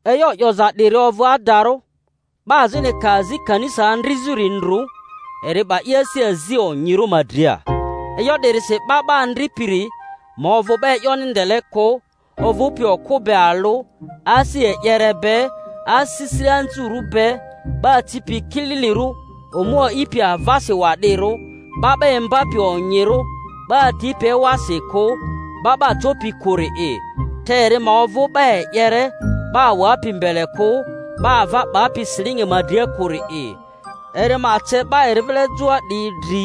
E'yo 'yoza 'diri ovᴜ adarᴜ: 'Ba azini ka azi kanisa andrizᴜri ndru, eri 'ba i asi azi onyirᴜ ma dria. E'yo 'dirisi 'ba 'ba andripiri ma ovᴜ 'ba e'yoni ndele kᴜ, ovᴜpi okᴜ be alᴜ, asi e'yere be, asisile anzurᴜ be, 'ba acipi kililirᴜ, omu a'ipi avasi wa'dirᴜ, 'ba 'ba imbapi onyirᴜ, 'ba atipi ewasi kᴜ, 'ba 'ba copi kᴜri'i; te eri ma ovᴜ 'ba e'yere, 'ba awapi mbele kᴜ, 'ba ava 'bapi silingi ma dria kᴜri'i. Eri ma ce 'ba eri vile joa 'diyi dri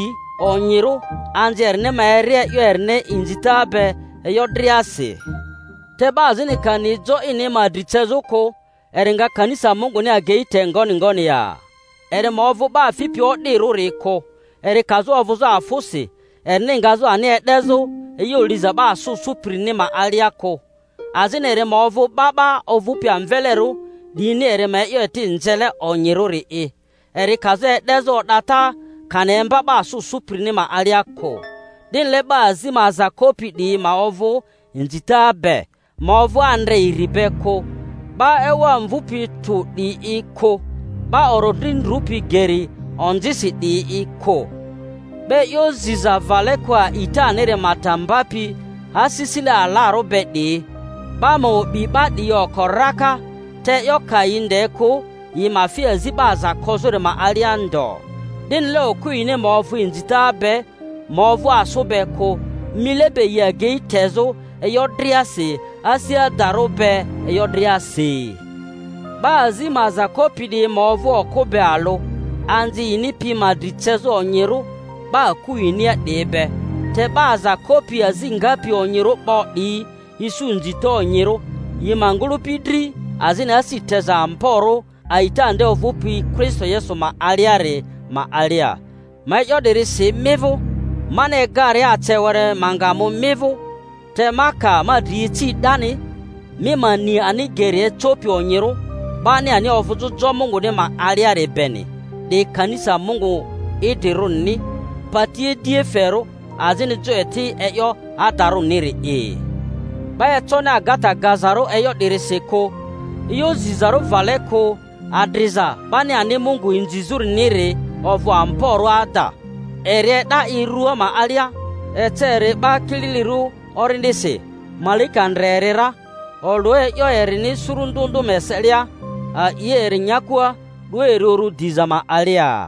onyirᴜ, anzi erini ma eri e'yo erini inzita be e'yo driasi; te 'ba azini ka ni jo ini ma dri cezᴜ kᴜ, eri nga kanisa Munguni agei te ngoni ngoni ya? Eri ma ovᴜ 'ba fipi o'dirᴜri kᴜ, eri kazᴜ ovᴜzᴜ afᴜsi erini ngazᴜ ani e'dezᴜ e'yo liza 'ba asᴜ sᴜpirini ma alia kᴜ; azini eri ma ovᴜ 'ba 'ba ovᴜpi amvelerᴜ 'diyini eri ma e'yo eti nzele onyirᴜ-ri'i, eri kazᴜ e'dezᴜ o'data kani emba 'ba asᴜ sᴜpirini ma alia kᴜ. 'Dinile 'ba azi ma aza kopi 'diyi ma ovᴜ inzita be, ma ovᴜ andre iri be kᴜ, 'ba ewa mvupi tᴜ 'diyi'i kᴜ, 'ba orodri ndrupi geri onzisi 'diyi'i kᴜ; 'ba e'yo ziza vale kᴜ a'itaniri ma ta mbapi asisile alarᴜ be 'diyi. 'Ba ma o'bi 'ba 'diyi oko raka te e'yo ka yi nde kᴜ, yi ma fi azi 'ba aza kozᴜri ma alia ndo. 'Dinile okᴜ yini ma ovᴜ inzita be, ma ovᴜ asᴜ be kᴜ, mile be yi agei tezᴜ e'yo driasi, asi adarᴜ be e'yo driasi. 'Ba azi ma aza kopi 'diyi ma ovᴜ okᴜ be alᴜ, anzi yini pi ma dri cezᴜ onyirᴜ 'ba aku yinia 'diyi be; te 'ba aza kopi azi ngapi onyirᴜ 'bo 'diyi isu inzita onyirᴜ yi ma ngᴜlᴜpi dri, azini asi teza amborᴜ a'ita nde ovᴜpi Kristo Yesu ma aliari ma alia. Ma e'yo 'diri si mi vᴜ mani egaria ace were ma nga mu mi vᴜ, te ma ka ma dri ici 'dani, mi ma ni ani geri ecopi onyirᴜ 'bani ani ovᴜzᴜ jo Munguni ma aliari beni, 'di kanisa Mungu idrirᴜrini, pati idiaferᴜ azini jo eti e'yo adarᴜniri'i. 'Ba econi agata gazarᴜ e'yo 'dirisi kᴜ, e'yo zizarᴜ vale kᴜ adriza 'bani ani Mungu inzizᴜriniri ovᴜ amborᴜ ada: Eri e'da i rᴜa ma alia, ece eri 'ba kililirᴜ Orindisi, malaika ndre eri ra, olᴜ e'yo erini suru ndᴜ ndᴜ ma eselia, a'i eri nyakua, 'du eri uru diza ma alia.